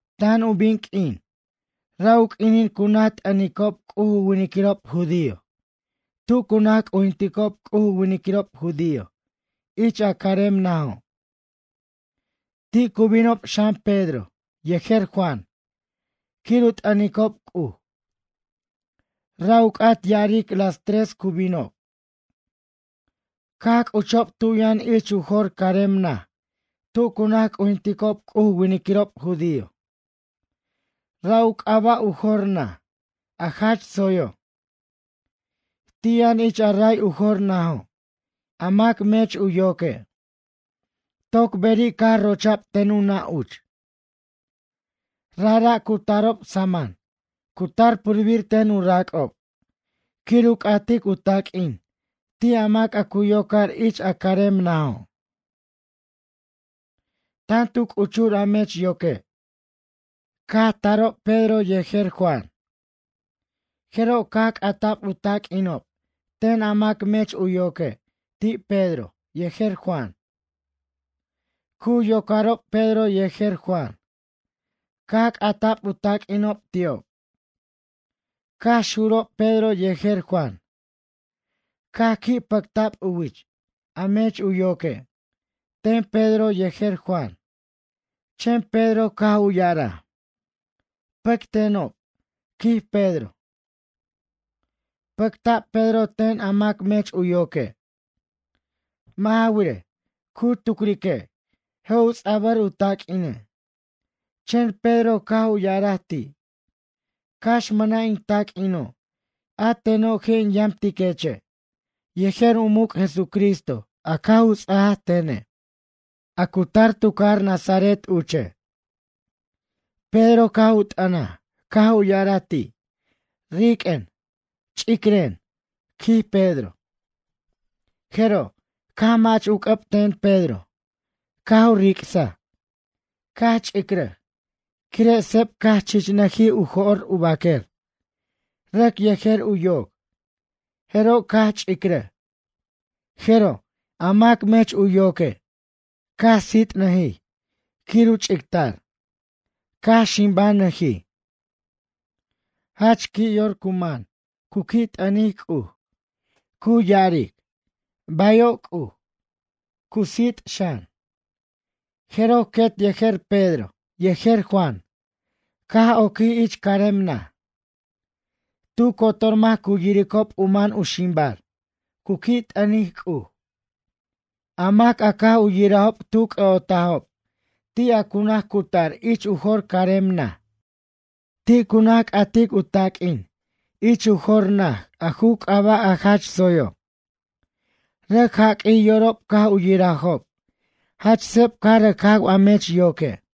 Tan u bin q'uin, ra' u q'uinin cu naj t'ʌnicob C'uj u winiquirob judío tu cu naj c'ujinticob C'uj u winiquirob judío ich a carem najo'. Ti' cu binob xan Pedro yejer Juan, quir u t'ʌnicob C'uj. Ra' u c'at ya'aric las tres cu binob. Caj c'uchob tu yʌn ich u jor carem naj tu cu naj c'ujinticob C'uj u winiquirob judío, ra' u c'aba' u jor naj, A Jach Tsoyo'. Ti' yʌn ich a ray u jor najo' a mac mech u yoque'. Toc beri' caj rocha'b ten u nʌ' uch. Rajra' cu tarob saman cu tar purbir ten u rac'ob, quir u c'atic u taq'uin ti' a mac a cu yocar ich a carem najo'. Tan tu c'uchur a mech yoque' caj tarob Pedro yejer Juan. Jeroj caj c'ata'b u taq'uinob ten a mac mech u yoque' ti' Pedro yejer Juan. Cu yocarob Pedro yejer Juan, caj c'ata'b u taq'uinob ti'ob. Caj xurob Pedro yejer Juan, caj qui' pʌcta'b u wich, a mech u yoque', ten Pedro yejer Juan, chen Pedro caj u ya'araj: ―Pʌctenob ―quij Pedro. Pʌcta'b Pedro ten a mac mech u yoque'. Mʌ' ja wirej, cu tucrique', je' u ts'abʌr u taq'uine'. Chen Pedro caj u ya'araj ti': ―Cax mʌna' in taq'uino', a teno' je' in yamtiqueche' yejer u muc' Jesucristo a caj u ts'aj tene'. A cu tar tu cajar Nazaret uche'. Pedro caj u t'ʌnaj caj u ya'araj ti': ―Riq'uen, ch'icren ―quij Pedro. Jeroj, caj mach u c'ʌb ten Pedro caj u ric'saj, caj ch'icrʌj, quire' seb caj chichnʌjij u jo'r u baquer, rʌc yejer u yoc, jeroj caj ch'icrʌj. Jeroj, a mac mech u yoque', caj sit'nʌjij quir u ch'ictar, caj ximbanʌjij. Jach qui' yor cu man cu qui' t'ʌntic C'uj, cu ya'aric: “Bayo' C'uj.” Cu sit' xan, jeroj quet yejer Pedro yejer Juan caj oquij ich carem naj. Tu cotor mac cu yiricob u man u ximbar cu qui' t'ʌntic C'uj. A mac a caj u yirajob tu c'ʌ'otajob ti' a cu naj cutar ich u jor carem naj. Ti' cu naj c'atic u taq'uin ich u jor naj a ju c'aba' A Jach Tsoyo'. Rʌc jaq'uij yorob caj u yirajob jach seb caj rʌc jaw a mech yoque'.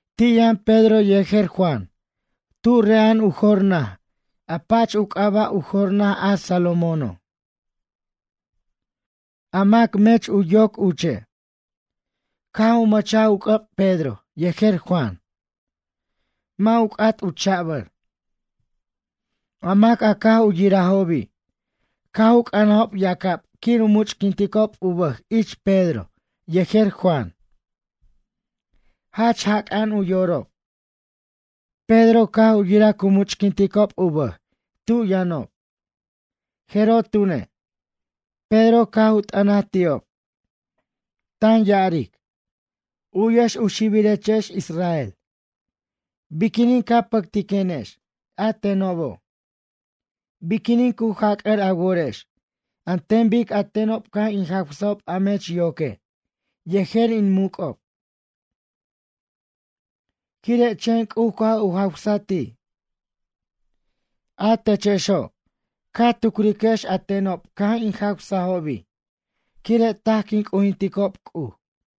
Ti' yʌn Pedro yejer Juan tu re'a'an u jor naj a pach u c'aba' U Jor Naj a Salomóno'. A mac mech u yoc uche', caj u mʌchaj u c'ʌb Pedro yejer Juan. Mʌ' u c'at u cha'bʌr. A mac a caj u yirajobi' caj u c'ʌnajob yacab quir u much'quinticob u bʌj ich Pedro yejer Juan. Jach jac'a'an u yorob. Pedro caj u yiraj cu much'quinticob u bʌj tu yʌnob, jeroj tune', Pedro caj u t'ʌnaj ti'ob, tan ya'aric: ―U'yex u xibirechex Israel, biquinin ca pʌctiquenex a tenobo'? Biquinin cu jac'ʌr a worex an ten bic a tenob caj in jawsajob a mech yoque' yejer in muc'ob? Quire' chen C'uj caj u jawsaj ti'. A techexo', ca tucriquex a tenob caj in jawsajobi', quire' taj quin c'ujinticob C'uj.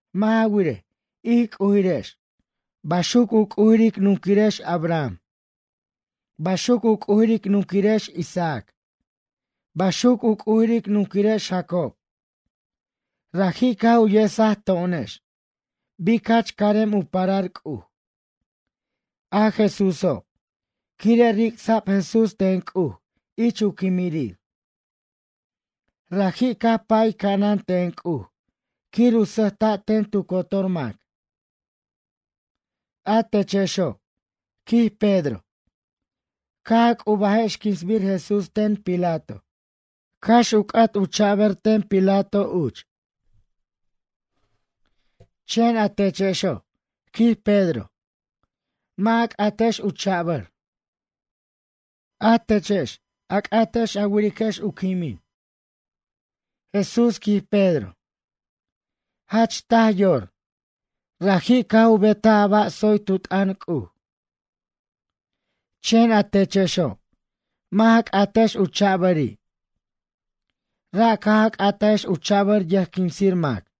Mʌ' ja wirej, ij c'ujirex, baxuc u c'ujir ic nunquirex Abraham, baxuc u c'ujir ic nunquirex Isaac, baxuc u c'ujir ic nunquirex Jacob, raji' caj u yesaj to'onex bic jach carem u parar C'uj, a Jesúso', quire' ricsa'b Jesús ten C'uj ich u quimirir. Raji' caj pay ca'anan ten C'uj quir u sʌjta' ten tu cotor mac. A techexo' ―quij Pedro―, caj a c'ubajex quinsbir Jesús ten Pilato, cax u c'at u cha'bʌr ten Pilato uch. Chen a techexo' ―quij Pedro―, mʌ' a c'atex u cha'bʌr. A techex, a c'atex a wiriquex u quimin. Jesús ―quij Pedro―, jach taj yor, raji' caj u betaj a ba' tsoy tu t'ʌn C'uj. Chen a techexo', mʌ' ja c'atex u cha'bʌri'. Ra' caj a c'atajex u cha'bʌr yʌjquinsir mac.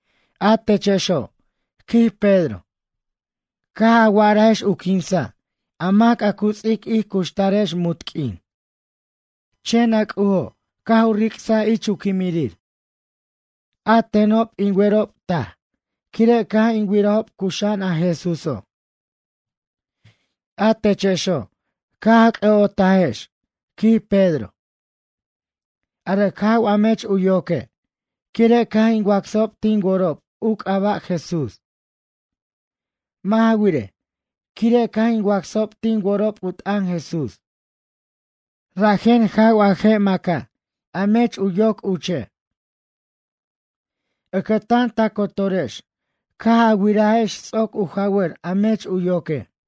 A techexo' ―quij Pedro―, caj a wa'arajex u quinsa' a mac a cu ts'ic ij cuxtarex munt q'uin. Chen a C'ujo' caj u ricsaji' ich u quimirir. A tenob in werob taj quire' caj in wirajob cuxa'an a Jesúso'. A techexo', caj a c'ʌ'otajex ―quij Pedro―, a rʌc jaw a mech u yoque', quire' caj in wacsajob tin worob u c'aba' Jesús. Mʌ' ja wirej, quire' caj in wacsajob tin worob u t'ʌn Jesús rajen jaw a je' maca' a mech u yoc uche'. Ʌcʌtan ta cotorechex caj a wirajex ts'oc u jawʌr a mech u yoque'.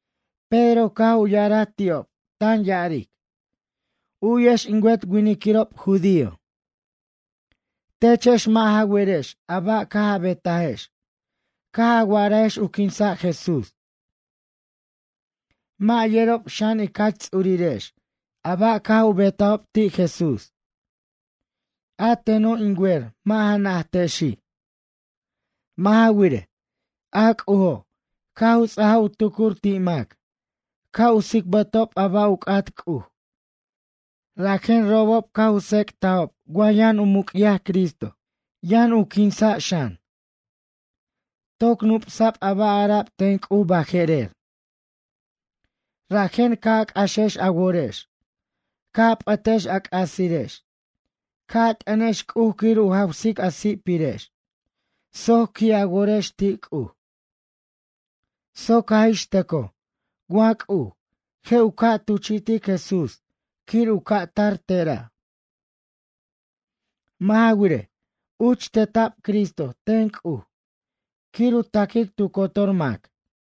Pedro caj u ya'araj ti'ob tan ya'aric: ―U'yex in wet winiquirob judío. Techex mʌ' ja werex a ba' caj a betajex caj a wa'arajex u quinsa' Jesús. Mʌ' yerob xan ic jach ts'urirex a ba' caj u betajob ti' Jesús. A teno' in wer mʌ' ja najtexi'. Mʌ' ja wirej, a C'ujo' caj u ts'aj u tucur ti' mac ca' u tsicbʌtob a ba' u c'at C'uj rajen robob caj u tsec'tajob wa yʌn u muc'yaj Cristo, yʌn u quinsa' xan. Toc nup'sa'b a ba' ara'b ten C'uj baje'rer. Rajen ca' a c'axex a worex. Ca' a p'ʌtex a c'asirex. Ca' a t'ʌnex C'uj quir u jawsic a si'pirex soc qui' a worex ti' C'uj. Soc jaj ix tʌcoj wa C'uj, je' u ca' tuchi'tic Jesús quir u ca' tar tera'. Mʌ' ja wirej, uch teta'b Cristo ten C'uj quir u taquic tu cotor mac.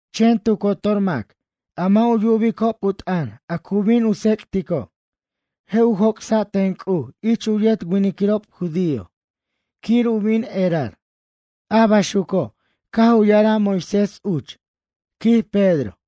Chen tu cotor mac a mʌ' u yubicob u t'ʌn a cu bin u tsec'tico', je' u joc'sa' ten C'uj ich u yet winiquirob judío quir u bin erar.” A baxuco' caj u ya'araj Moisés uch ―quij Pedro.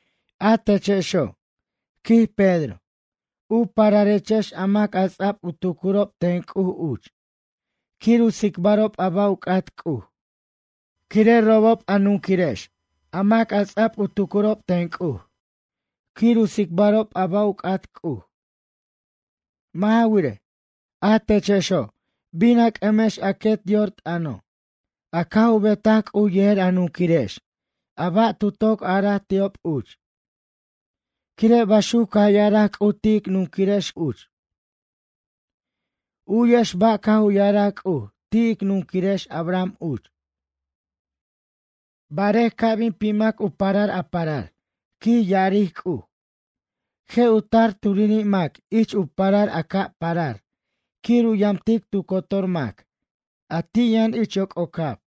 A techexo' ―quij Pedro―, u pararechex a mac a ts'a'b u tucurob ten C'uj uch, quir u tsicbarob a ba' u c'at C'uj, quire' robob a nunquirex a mac a ts'a'b u tucurob ten C'uj quir u tsicbarob a ba' u c'at C'uj. Mʌ' ja wirej, a techexo' bin a c'ʌmex a quet yor t'ʌno', a caj u betaj C'uj yejer a nunquirex a ba' tu toc araj ti'ob uch. Quire' baxuc caj ya'araj C'uj ti' ic nunquirex C'uj uch. U'yex ba' caj u ya'araj C'uj ti' ic nunquirex Abraham uch: “Barer ca' bin pimac u parar a parar, quij ya'aric C'uj, je' u tar turiri' mac ich u parar a ca' parar quir u yamtic tu cotor mac a ti' yʌn ich yoc'ocab.”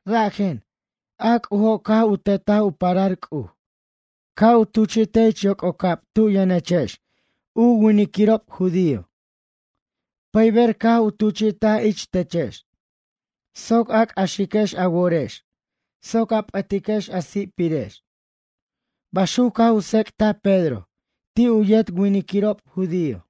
Rajen, a C'ujo' caj u tetaj u parar C'uj ca' u tuchi'tej ich yoc'ocab tu yʌnechex u winiquirob judío. Pʌyber caj u tuchi'taj ich techex soc a c'axiquex a worex soc a p'ʌtiquex a si'pirex ―baxuco' caj u tsec'taj Pedro ti' u yet winiquirob judío.